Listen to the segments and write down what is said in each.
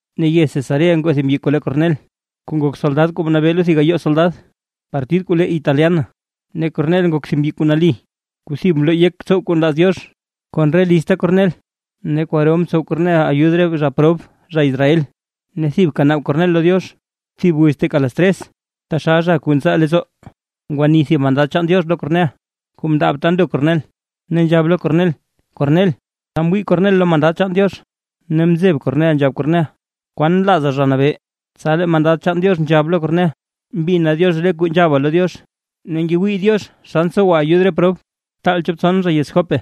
Ne yez Cesarea ngoo thib mbyi kuu le Kornel, kuu nak soldad kuu mnabee lo thib gayoo soldad, partid kuu le Italiana. Ne Kornel nak thib mbyi kuu nali kuu thib mloo yek tsow kuu nlaaz Diox kon re lizta Kornel, ne kwaro mtsow Kornel ayud re prob zha Israel, ne thibka naab Kornel lo Diox. Thib wiz teeka las tres, taxal zha kuu ntsaa leettsoo ngwani thib mandad chaan Diox lo Kornel kuu mndaab ta ndo Kornel, ne nzhab lo Kornel: ―¡Kornel! Tsa mwii Kornel lo mandad chaan Diox ne mzeb Kornel nzhab Kornel: ―¿Kwaan nlaaza, Zha Nabee? Tsa lee mandad chaan Diox nzhab lo Kornel: ―Mbina Diox re kuu nzhaba lo Diox, ne ngewii Diox xa ntsowa ayud re prob. Btaal chop tson zha yez Jope,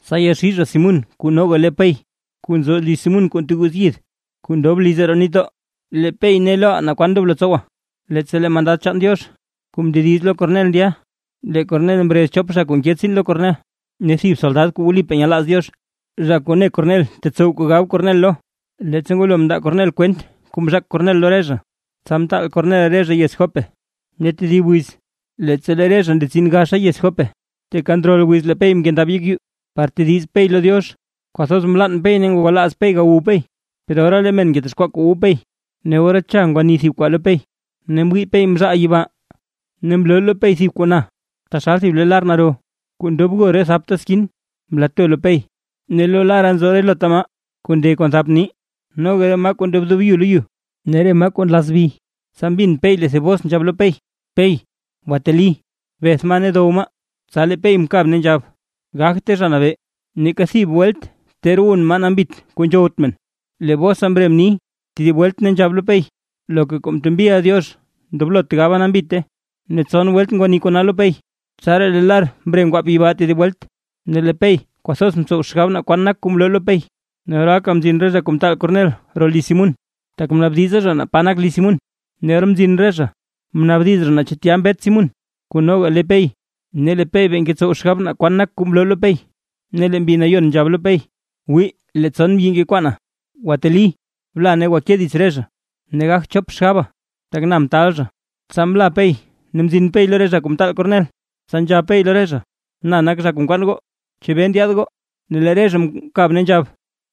tsa yaxii zha Simún kuu noga le Pey. Kuu nzo liz Simún kuu nteguuz yid, kuu ndob liz roo nitdoo, lee Pey ne loʼa naa kwan ndoblo tsowa. Leettsa lee mandad chaan Diox kuu mndediz lo Kornel ndya, lee Kornel mrez chop zha kuu nke tsiin lo Kornel, ne thib soldad zha kuu wlipaa nyelaaz Diox, zha kuu ne Kornel tetsow kuu gab Kornel lo. Leettsa ngwalo mndaa Kornel kwent kuu mzhaak Kornel lo re zha, tsa mtaal Kornel re zha yez Jope. Ne tedib wiz, leettsa lee re zha ndetsin gaxa yez Jope, teeka ndrol wiz lee Pey mkendab yek yuu, par tediz Pey lo Diox. Kwathoz mlann Pey ne ngwalaaz Pey gawu Pey, per ora lee men ngetexkwaa kuu wu Pey, ne ora cha ngwani thib kwaa lo Pey, ne mwii Pey mzhaal yibaa, ne mloo lo Pey thib kuu naa taxal thib le lar naro kuu ndob bgo re thapta skin, mlato lo Pey. Ne lo lara nzo relota maa kuu nde kon thap nii, noga re maa kuu ndedoob yu lo yu, ne re maa kuu nlazbi. Tsa mbin Pey thib bos kuu nzhab lo Pey: ―Pey, gwateli, beth maa ne dow maa. Tsa lee Pey mkab ne nzhab: ―Gagte, Zha Nabee; neeka thib welt ter wun maa nambit kuu nzhowt men. Lee bosa mre mni tedib welt, ne nzhab lo Pey: ―Loka kuu mtembiʼa Diox, ndoblot gaba nambite. Ne tson welt ngwani kona lo Pey, tsaraa lee lar mre ngwaap yibaa tedib welt. Ne lee Pey kwathoz mtsow xgab naa kwan nak kuu mloo lo Pey, ne oraaka mzin re zha kuu mtaal Kornel roo liz Simún, tak mnaabdiza zha naa pa nak liz Simún. Ne or mzin re zha, mnaabdiz zha naa chu tya mbet Simún, kuu noga le Pey. Ne lee Pey bee ngetsow xgab naa kwan nak kuu mloo lo Pey, ne lee Mbi Nayon nzhab lo Pey: ―Wii lee tson mbyi ngekwaana. Gwateli, bla ne ngwake dits re zha, ne gagt chop xgaba, tak na mtaal zha. Tsa mla Pey mzin Pey lo re zha kuu mtaal Kornel, tsa nzhab Pey lo re zha: ―Na nak zha kuu nkwaan goo, ¿chebee ndyaad goo? Ne lee re zha mkab, ne nzhab: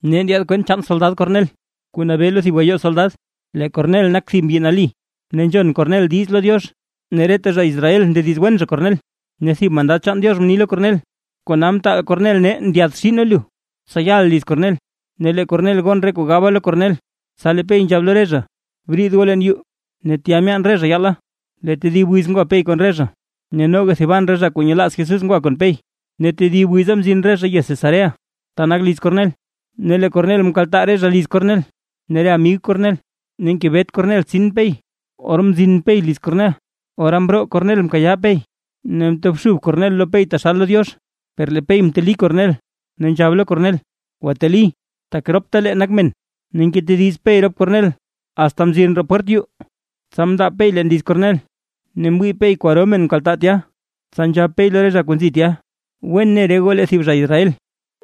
―Nee ndyaad kwent chaan soldad Kornel, kuu nabee lo thib gayoo soldad. Lee Kornel nak thib mbyi nali, ne nzhon Kornel diiz lo Diox ne reta zha Israel ndediz wen zha Kornel. Ne thib mandad chaan Diox mni lo Kornel: Kona mtaal Kornel nee ndyaadxii nee lu, tsa yaʼa liz Kornel, ne lee Kornel gon re kuu gaba lo Kornel. Tsa lee Pey nzhab lo re zha: ―Briid goo leen yuu. Ne tya myaan re zha yaala, lee tedib wiz ngwa Pey kon re zha, ne noga thiban re zha kuu nyelaaz Jesús ngwa kon Pey. Ne tedib wiza mzin re zha yez Cesarea, ta nak liz Kornel, ne lee Kornel mkaltaa re zha Liz Kornel ne re amig Kornel ne ngebet Kornel tsin Pey. Or mzin Pey liz Kornel, ora mroo Kornel mkayaa Pey ne mtobxub Kornel lo Pey taxal lo Diox. Per lee Pey mteli Kornel, ne nzhab lo Kornel: ―Gwateli, tak roptalee nak men. Ne ngetediz Pey rop Kornel asta mzin roo pwert yuu, tsa mndaab Pey leen liz Kornel, ne mwii Pey kwaro men mkaltaa tya. Tsa nzhab Pey lo re zha kuu nzi tya: ―Wen ne re goo lee thib zha Israel,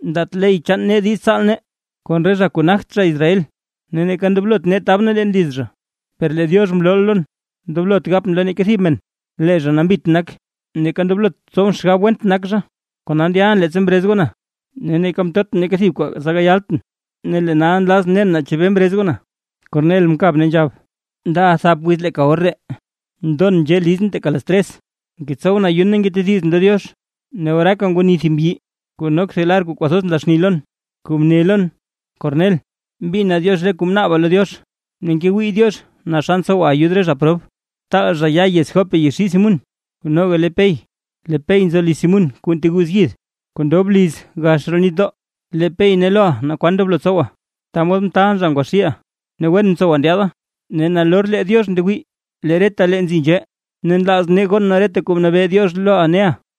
ndaat ley chaan nee diiz tsaal nee kon re zha kuu nagt zha Israel, ne neeka ndoblot nee tab nee leen liz zha, per lee Diox mlooʼa lon, ndoblot gapʼn lo neeka thib men lee zha nambit nak, neeka ndoblot tsowʼn xgab went nak zha. Kona ndyalʼn leettsa mrez goo na, ne neeka mtotʼn neeka thib kuu tsa gayaltʼn. Ne lee nal nlazʼn nen naa chebee mrez goo na. Kornel mkab ne nzhab: ―Ndaʼa thap wiz leeka or ree, ndon nzhee lizʼn teeka las tres, ngetsowʼn ayun ne ngetedizʼn lo Diox, ne oraaka ngwani thib mbyi kuu nok thib lar kuu kwathoz nla xni lon. Kuu mne lon: “Kornel, mbina Diox re kuu mnaaba lo Diox, ne ngewii Diox naa xa ntsowa ayud re zha prob. Btaal zha ya yez Jope yaxii Simún, kuu noga le Pey, lee Pey nzo liz Simún kuu nteguuz yid kuu ndob liz gax roo nitdoo, lee Pey ne loʼa naa kwan ndoblo tsowa.” Ta mod mtaalʼn zha ngwaxiiʼa. Ne wen mtsowa ndyaada, ne nalor lee Diox ndewii lee retalee nzi nzhee ne nlaaz nee gon nee reta kuu mnabee Diox loʼa neʼa.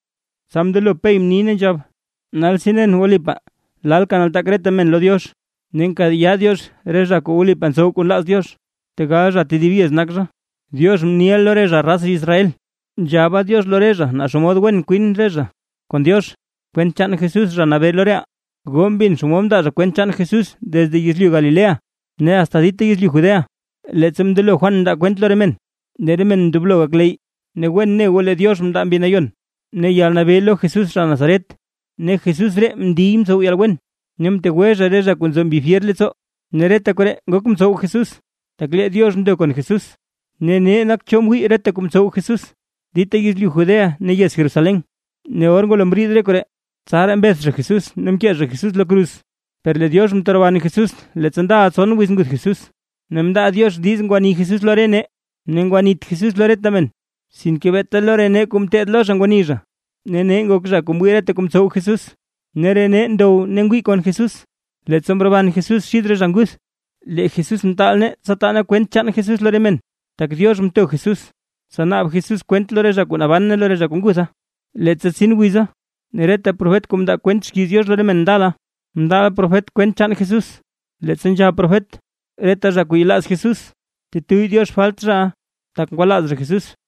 Tsa mndelo Pey mni ne nzhab: ―Nalsi nen wlipaa lalka nataak reta men lo Diox. Ne nkayaa Diox re zha kuu wlipaa ntsow kuu nlaaz Diox, tegal zha tedib yez nak zha. Diox mniʼa lo re zha raz Israel, nzhaba Diox lo re zha naa xomod wen kwin re zha kon Diox, kwent chaan Jesús, Zha Nabee lo reʼaa. Goo mbin xomod mndaa zha kwent chaan Jesús desde yezlyu Galilea ne asta dita yezlyu Judea, leettsa mndelo Juan mndaa kwent lo re men, lee re men ndoblo gakleyy. Ne wen ne goo lee Diox mndaa Mbi Nayon ne yalnabee lo Jesús zha Nazaret, ne Jesús ree mndiy mtsow yalwen ne mtegwe re zha kuu nzo mbi fyer leettsoo, ne reta koree ngok mtsow Jesús, tak lee Diox ndo kon Jesús. Ne nee nak cho mwii reta kuu mtsow Jesús dita yezlyu Judea ne yez Jerusalén. Ne or ngwalo mriid koree, tsaraa mbeth zha Jesús ne mkee zha Jesús lo kruz. Per lee Diox mteroban Jesús leettsa ndaʼa tson wiz nguth Jesús, ne mndaa Diox diiz ngwani Jesús lo re nee. Ne ngwanit Jesús lo reta men, sinke beeta lo re nee kuu mteed lo zha ngwani zha, ne nee ngok zha kuu mwii reta kuu mtsow Jesús. Ne re nee ndow ne ngwii kon Jesús, leettsa mroban Jesús xid re zha nguth. Lee Jesús mtaal nee tsa taa nee kwent chaan Jesús lo re men, tak Diox mto Jesús, tsa naab Jesús kwent lo re zha kuu naban ne lo re kuu ngutha, leettsa tsin wiza. Ne reta profet kuu mndaa kwent xkiiz Diox lo re men ndala, mndaaʼa profet kwent chaan Jesús, leettsa nzhab profet: “Reta zha kuu yelaaz Jesús; tetuyy Diox falt zhaʼa, tak ngwalaaz zha Jesús”.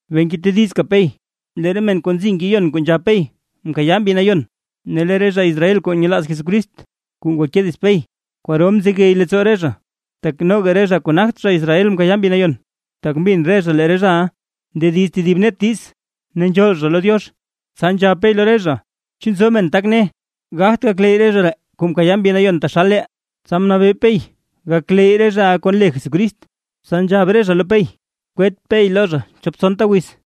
Bee ngetedizka Pey, lee re men kuu nzi ngeyon kuu nzhab Pey mkayaa Mbi nayon. Ne lee re zha Israel kuu nyelaaz Jesucrist kuu ngwake dits Pey, kwaro mzegey leettsoo re zha, tak noga re zha kuu nagt zha Israel mkayaa Mbi Nayon. Tak mbin re zha lee re zhaʼa ndediz tedib net diiz ne nzhool zha lo Diox. Tsa nzhab Pey lo re zha: ―¿Chu nzo men tak ne, gagt gakleyy re zha ree kuu mkayaaʼa Mbi Nayon taxal reʼaa? Tsa mnabee Pey gakleyy re zhaʼa kon le Jesucrist. Tsa nzhab re zha lo Pey kwet Pey lo re zha chop tsonta wiz.